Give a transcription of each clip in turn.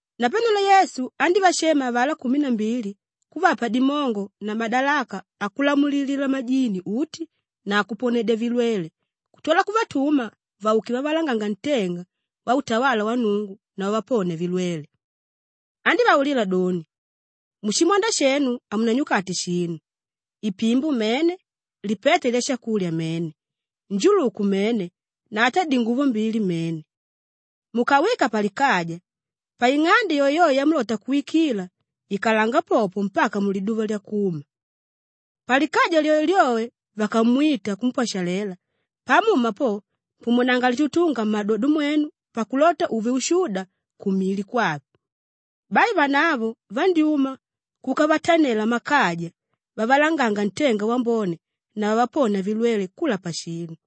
Napanelo Yesu andívashema avalá kumi na mbili kuvapa dimongo na madalaka akulamulilila majini uti na akuponedya vilwele kutwala kuvatuma vauke vavalanganga ntenga wautawala wa Nnungu na vaponia vilwele. Andívaulila doni, “Mushimwanda shenu hamunanyukate shinu; ipimbo mene, lipeta lyashakulya mene, njuluku mene na ata dinguvo mbili mene. Mukawika palikaja, paing'ande yoeyoe yamulota kuwikila, ikalanga popo mpaka muliduva lyakuma. Palikaja lyoelyoe vakamwita kumpwashalela, pamuma po pumunanga litutunga mmadodo mwenu pakulota uve ushuda kumili kwave.” Bai vanavo vandyúma kuka vatanela mmakaja vavalanganga ntenga wambone na vavaponia valwele kula pashinu.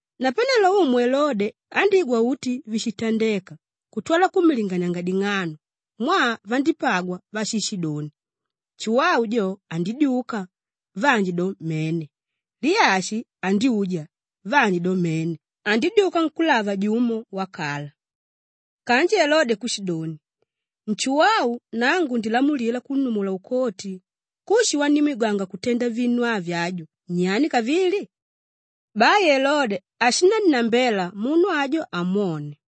Napanelo umu Elode andígwa uti víshitandeka kutwala kummilinganianga ding'ano mwaa vandípagwa váshishidoni, “Nshuwau jo, andidyuka,” vanji doni, “Mene, Liyashi andyuja,” vanji doni, “Mene, andidyuka nkúlava jumo wakala.” Kanji Elode kushidoni, “Nshuwau, nangu ndilamulila kunnumula ukoti! Kushi wanimwigwanga kutenda vinu avi aju, nyani kavili?” Bai Elode ashinannambela munu ajo amwone.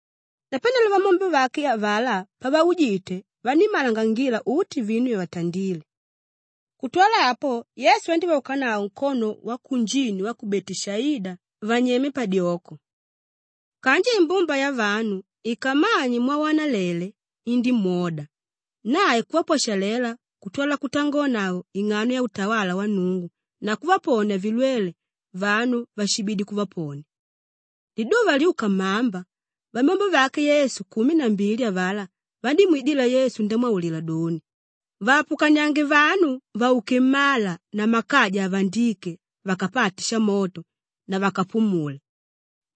Napanelo vamyombe vake avalá pavaujite vanímmalangangila uti vinu vyavatandile. Kutwala apo Yesu andívaukanavo nkono wakunjini wa Beteshaida vanyema padyoko. Kanji imbumba yavanu ikammanye mwawanalele, indímwoda. Nae kuvapwashalela kutwala kutangonavo ing'ano yautawala wa Nnungu na kuvaponia vilwele vanu váshibidi kuvaponia. Liduva lyuka mmamba, vamyombe vake Yesu kumi na mbili avalá vandímwidila Yesu ndamwaulila doni, “Vaapukaniange vanu vauke mmala na mmakaja avandíke vakapate shamoto na vakapumule.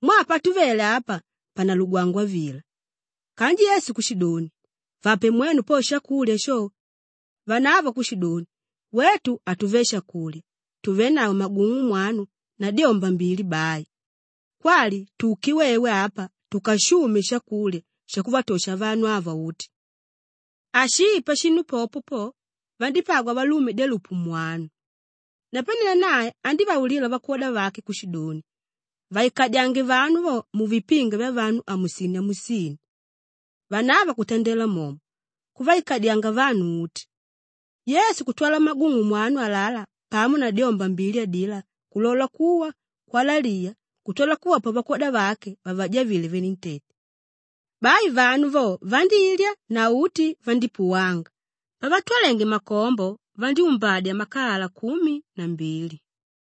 Mwaa patuvele apa panalugwangwa vila.” Kanji Yesu kushidoni, “Vape mwenu po shakulya sho!” Vanavo kushidoni, “Wetu hatuve shakulya! Tuvenavo magung'u mwanu na dyomba mbili bai. Kwali tuke wewe apa tukashume shakulya shakuvatosha vanu ava uti.” Ashii pashinu popo po, vandípagwa valume dyalupu mwanu. Napanelo nae andívaulila vakwoda vake kushidoni, “Vaikadyange vanu vo muvipinga vyavanu amusini-amusini.” Vanavo kutandela momo, kuvaikadyanga vanu uti. Yesu kutwala magung'u mwanu alalá pamo na dyomba mbili adilá kulola kuwa kwalaliya kutwala kuvapa vakwoda vake vavajavile venentete. Bai vanu vo vandílya na uti vandípuwanga; pavatwalenge makombo vandyúmbadya makalala kumi na mbili.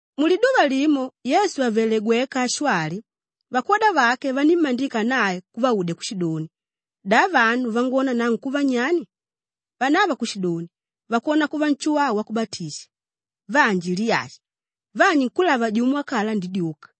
Muliduva limo Yesu àvele gweka ashwali, vakwoda vake vanímmandika nae kuvaudya kushidoni, “Da vanu vangwona nangu kuva nyani?” Vanavo kushidoni, “Vakwona kuva Nshuwau Wakubatisha, vanji Liyashi, vanji nkúlava jumo wakala andidyuka.”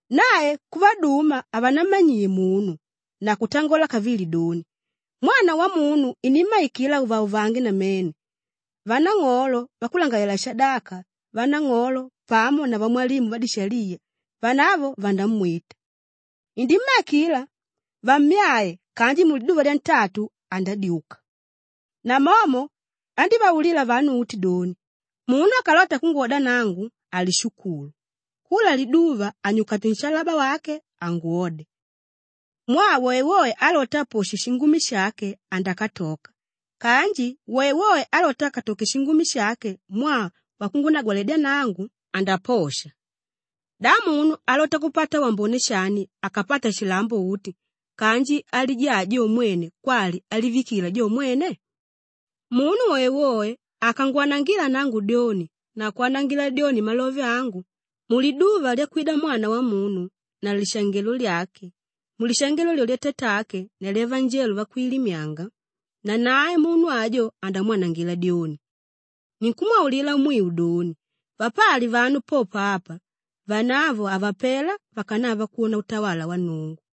Nae kuvaduma havanammanyiye munu na kutangola kavili doni, “Mwana Wamunu inimmaikila auvauvange namene; vanang'olo, vakulangalalela-shadaka vanang'olo pamo na vamwalimu vadishaliya, vanavo vandamwita. Indimmaikila vamyae kanji muliduva lyantatu andadyuka.” Namomo andívaulila vanu uti doni, “Munu akalota kungwoda nangu, alishukulu; kula liduva anyukate nshalaba wake angwode. Mwaa woewoe álota aposhe shingumi shake andakatoka kanji woewoe álota akatoke shingumi shake mwaa wakungunagwaledya nangu, andaposha. Da munu alota kupata wambone shani akapata shilambo uti kanji alijaa jo mwene kwali alivikila jo mwene? Munu woewoe akangwanangila nangu dyoni na kwanangila dyoni malove angu, muliduva lyakwida Mwana Wamunu na lishangelo lyake, mulishangelo lyolyo lyatatake na lyavanjelo vakwilimyanga, nanae munu ajo andamwanangila dyoni. Ninkumwaulila mwiu doni, vapali vanu popo apa, vanavo havapela vakanava kwona utawala wa Nnungu.”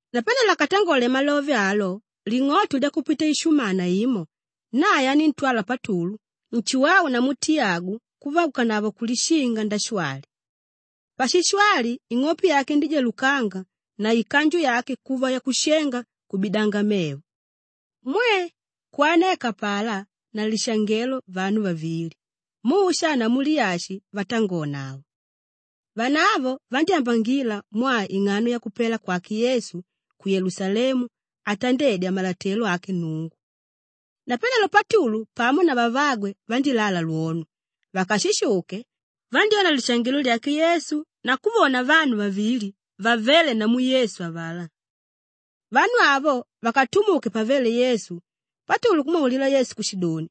Napanelo akatangole malove alo, ling'oto lyakupita ishumana imo, nae aníntwala Patulu, Nshuwau namu Tiyagu kuvaukanavo kulishinga ndashwali. Pashishwali ing'ope yake indíjalukanga na ikanju yake kuva yakushenga kubidanga mevo. Mwe! Kwaneka apalá na lishangelo vanu vavili, Musha namu Liyashi vatangonavo. Vanavo vandyámbangila mwaa ing'ano yakupela kwake Yesu ku Yelusalemu atandedya malotelo ake Nnungu. Napanelo Patulu pamo na vavagwe vandílala lwono; vakashishuke, vandyóna lishangelo lyake Yesu na kuvona vanu vavili vavéle namu Yesu avalá. Vanu avo vakatumuke pavéle Yesu, Patulu kumwaulila Yesu kushidoni,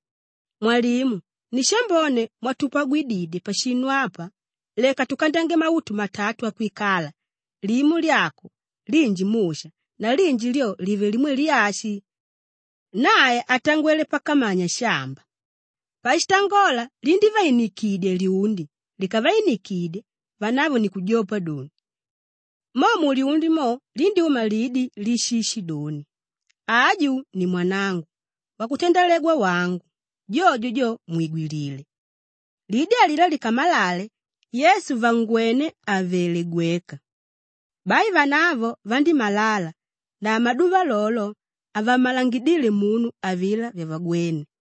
“Mwalimu! Ni shambone mwatupagwididye pashinu apa, leka tukandyange mautu matatu akwikala; limo lyako, linji Musha na linji lyo live limwe Liyashi.” Nae atangwele pakamanya shamba. Pashitangola lindívainikidya lyundi; likavinikidye, vanavo ni kujopa doni. Mo mulyundi mo lindyúma lidi líshishidoni, “Aju ni mwanangu, wakutandalegwa wangu, jojo jo mwigwilile!” Lidi alilá likamalale, Yesu vangwené àvele gweka. Bai vanavo vandímalala na mumaduva lolo, havammalangidíle munu avilá vyavagwéne.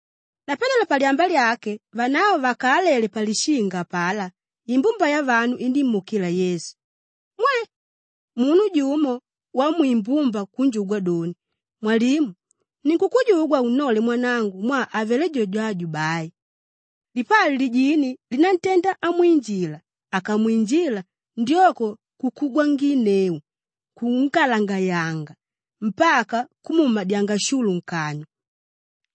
Napanelo palyamba lyake vanavo vakaalele palishinga apalá, imbumba yavanu indímuukila Yesu. Mwe! Munu jumo wamwimbumba kunjugwa doni, “Mwalimu! Ninkukujugwa unnole mwanangu mwaa avelé jojo aju bai. Lipali lijini línantenda amwinjila; akamwinjila, ndyoko kukugwanginneu, kungalagayanga mpaka kumuumadyanga shulu nkanywa.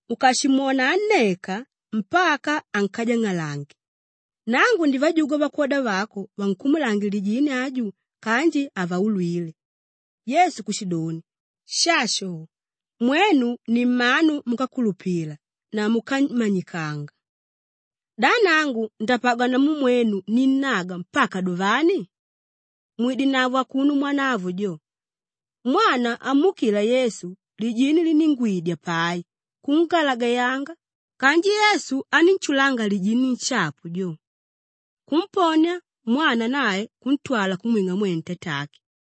Ukashimwona anneka mpaka ankajang'alange. Nangu ndivajugwa vakwoda vako vankumulange lijini ajo kanji havaulwile.” Yesu kushidoni, “Shasho! Mwenu ni mmanu múkakulupila na múkamanyikanga! Da nangu ndapagwa namu mwenu ninnaga mpaka duvani? Mwidenavo akuno mwanavo jo.” Mwana amuukila Yesu, lijini liníngwiidya pai kungalagayanga kanji Yesu anínshulanga lijini nshapu jo, kumponia mwana nae kuntwala kumwing'a mwene tatake.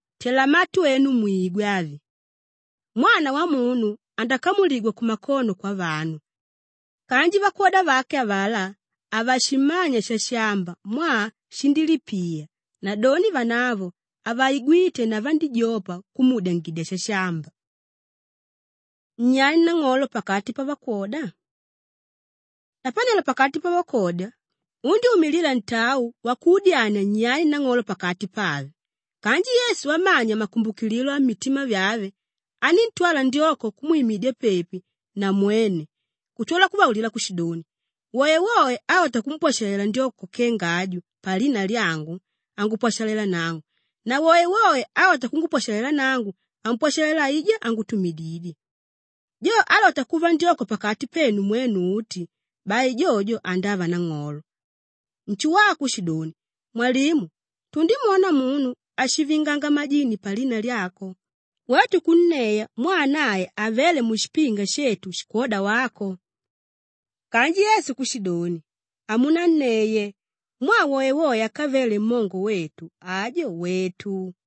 “Tela matu enu mwigwe avi! Mwana Wamunu andakamuligwa kumakono kwavanu.” Kanji vakwoda vake avalá, havashimanya shashamba mwaa shindílipiya nadoni vanavo havaigwíte na vandíjopa kumuudyangidya shashamba. Nyani nang'olo pakati pavakwoda? Napanelo pakati pavakwoda, undyúmilila ntau wakudyania nyani nang'olo pakati pave. Kanji Yesu amanya makumbukililo ammitima vyave, aníntwala ndyoko kumwimidya pepi na mwene kutwala kuvaulila kushidoni, “Woewoe álota kumpwashalela ndyoko kenga aju palina lyangu, angupwashalela nangu na woewoe álota kungupwashalela nangu, ampwashalela aijá ángutumididye. Jo álota kuva ndyoko pakati penu mwenu uti, bai jojo andava nang'olo.” Nshuwau kushidoni, “Mwalimu! Tundimwona munu áshivinganga majini palina lyako, wetu kunneya mwaa nae havéle mushipinga shetu shikwóda wako.” Kanji Yesu kushidoni, “Hamunaneye! Mwaa woewoe ákavele mmongo wetu, ajo wètu.”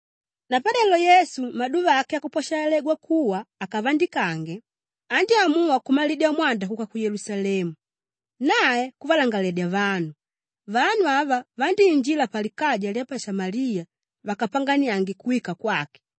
Napanelo Yesu maduva ake akupwashalalegwa kuwa akavandikange, andyámuwa kumalidya mwanda kuka ku Yelusalemu. Nae kuvalangaledya vanu; vanu ava vandíinjila palikaja lya pa Shamaliya vakapanganiange kuwika kwake.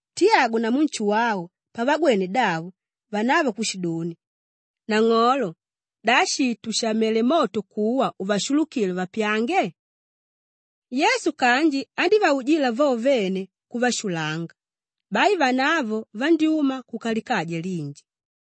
Kutwala vakwoda vake, Tiyagu namu Nshuwau pavagwene davo, vanavo kushidoni, “Nang'olo, da shii tushamele moto kuwa uvashulukile vapyange?” Yesu kanji andívaujila vo vene kuvashulanga. Bai vanavo vandyúma kuka likaja linji.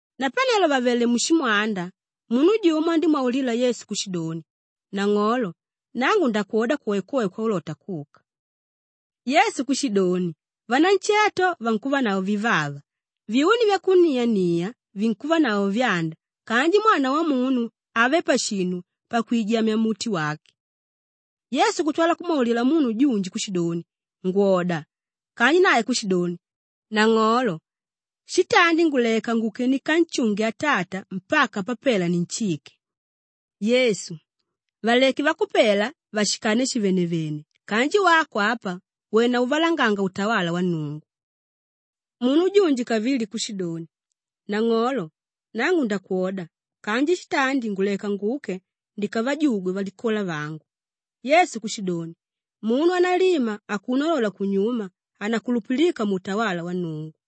Napanelo vàvele mushimwanda, munu jumo andímwaulila Yesu kushidoni, “Nang'olo, nangu ndakwoda kwoekwoe kwaulota kuka.” Yesu kushidoni, “Vanansheto vankuvanavo vivava, vyuni vyakuniania vinkuvanavo vyanda kanji Mwana Wamunu have pashinu pakwijamya muti wake.” Yesu kutwala kumwaulila munu junji kushidoni, “Ngwoda!” Kanji nae kushidoni, “Nang'olo, shitandi nguleka nguke ndikanshunge atata mpaka papela ninshike.” Yesu, “Valeke vakupela vashikane shivenevene kanji wako apa, wena uvalanganga utawala wa Nnungu.” Munu junji kavili kushidoni, “Nang'olo, nangu ndakwoda kanji shitandi nguleka nguke ndikavajugwe valikola vangu.” Yesu kushidoni, “Munu ánalima akuno alola kunyuma, hanakulupilika muutawala wa Nnungu.”